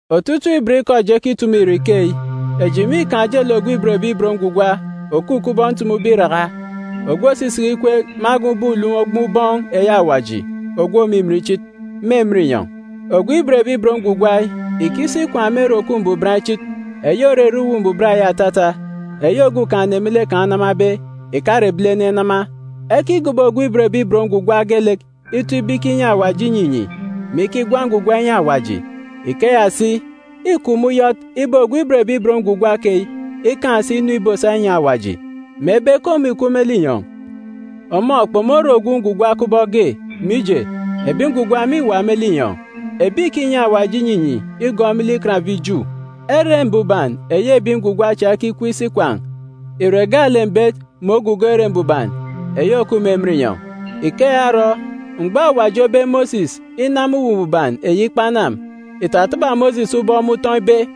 Otutuuk ibot ikọ eji ekitumu ire ikeyi: Eji mîkaan̄ ojelek ogwu òban Awaji òkup kubọk ntumube iraka, ogwu òsisiki ikweek irek me agan̄ ubọk ulom ogboon̄ ubọọn̄ eyi Awaji Ogwu Òmimin Ichit, me emen inyọn̄. Ogwu òban Awaji yi ìkisi ikwaan̄ me Ere Òkup Mbuban Ichit, eyi òrere Uwu Mbuban eyi atata, eyi Okumugwem me lek kan̄ onamabe, ìkare ebilene enama. Ekigobo ogwu òban Awaji geelek ito ibe ikinyi Awaji inyinyi, mè ikigwa ngwugwa inyi Awaji. Ikeya si, îkup me uyọt ibe ogwu òban Awaji keyi ikaan̄ si inu ìbosa inyi Awaji. Mebe ke ọmọ ìkup me linyọn̄, ọmọ kpomore ogwu ngwugwa kubọk ge, mije, ebi ngwugwa mîwa me linyọn̄, ebi ìkinyi Awaji inyinyi igọọk me lek Ikan ebi Ju. Ere Mbuban eyi ebi ngwugwa cha ekikup isi ikwaan̄ ìre gaalek mbet mè ogugo Ere Mbuban eyi òkup me emen inyọn̄. Ikeya orọ, mgbọ Awaji obe Mosis inama Atanga Chinichini, ìtataba Mosis ubọk me utọn̄ ibe,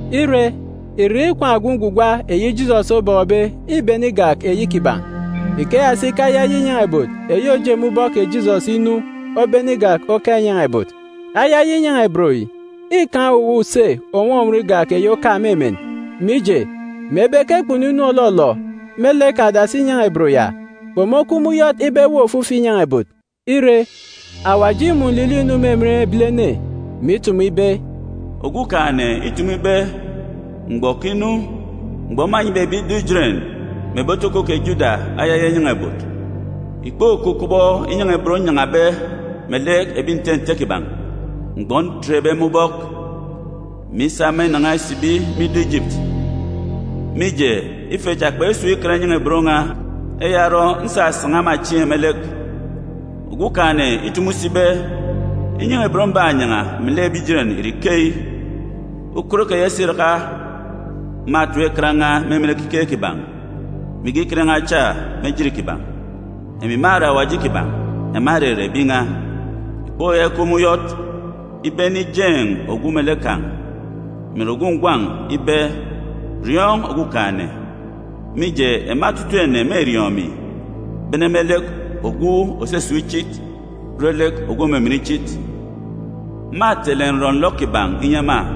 Ire, irek ikwaan̄ ogwu ngwugwa eyi Jisọs obọkọbe îbene igak eyi kiban̄. Ikeya si ke ayaya inyan̄a-ibot eyi òje me ubọk kè Jisọs inu obene igak oka inyan̄a-ibot. Ayaya inyan̄a-ibot yi îkaan̄ owuwa use ònwọnwọn igak eyi oka me emen. Mije, mebe ke kpunu inu òlọlọ me lek adasi inyan̄a-ibot ya, kpomokup me uyọt ibe eweek ofifi inyan̄a-ibot. Ire, Awaji îmun̄ nlilọ inu me emen ebilene, mè itumu ibe, “Okumugwem îtumu ibe, ‘Mgbọ òkinu, mgbọ mânyibe ebi ido Ijeren, mè ebi otoko kè Juda ayaya inyan̄a-ibot. Ìkpokup kubọk inyan̄a-ibot nnyan̄abe melek ebi nte nte kiban̄ mgbọ ntetbe ema ubọk, mè isa ema inan̄a isibi me ido Ijipiti, mije, ife cha kpesun̄ ikan inyan̄a-ibot n̄a. Eya orọ, nsasan̄a ema chieen̄ me lek.’ Okumugwem îtumu si ibe, ‘Inyan̄a-ibot mbanyan̄a melek ebi Ijeren ìre ikeyi: Ukot keya isiraka, mâtap ikan n̄a me emen ekiket kiban̄, mè ige ikan cha me ejit kiban̄. Emi mâre Awaji kiban̄, ema mêrere ebi n̄a. Ìkpoyaka ikup me uyọt ibe ene geege ijeen̄ ogwu melek kan̄, mè ìre ogwu ngwan̄ kan̄ ibe, “Riọọn̄ Okumugwem,” mije, ema otutuuk ene mêriọọn̄ emi, bene me lek ogwu òsisip ichit re lek ogwu òmimin ichit. Mâtele nrọ-nlọ kiban̄ inyi ema,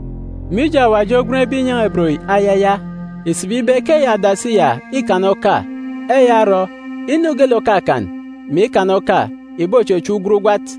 Mije Awaji ogwenbe inyan̄a-ibot yi “ayaya,” ìsibi ibe ke eyi adasi ya îkana oka. Eya orọ, inu geelek òkakan, mè ikana oka ìbochechep ugwat ugwat.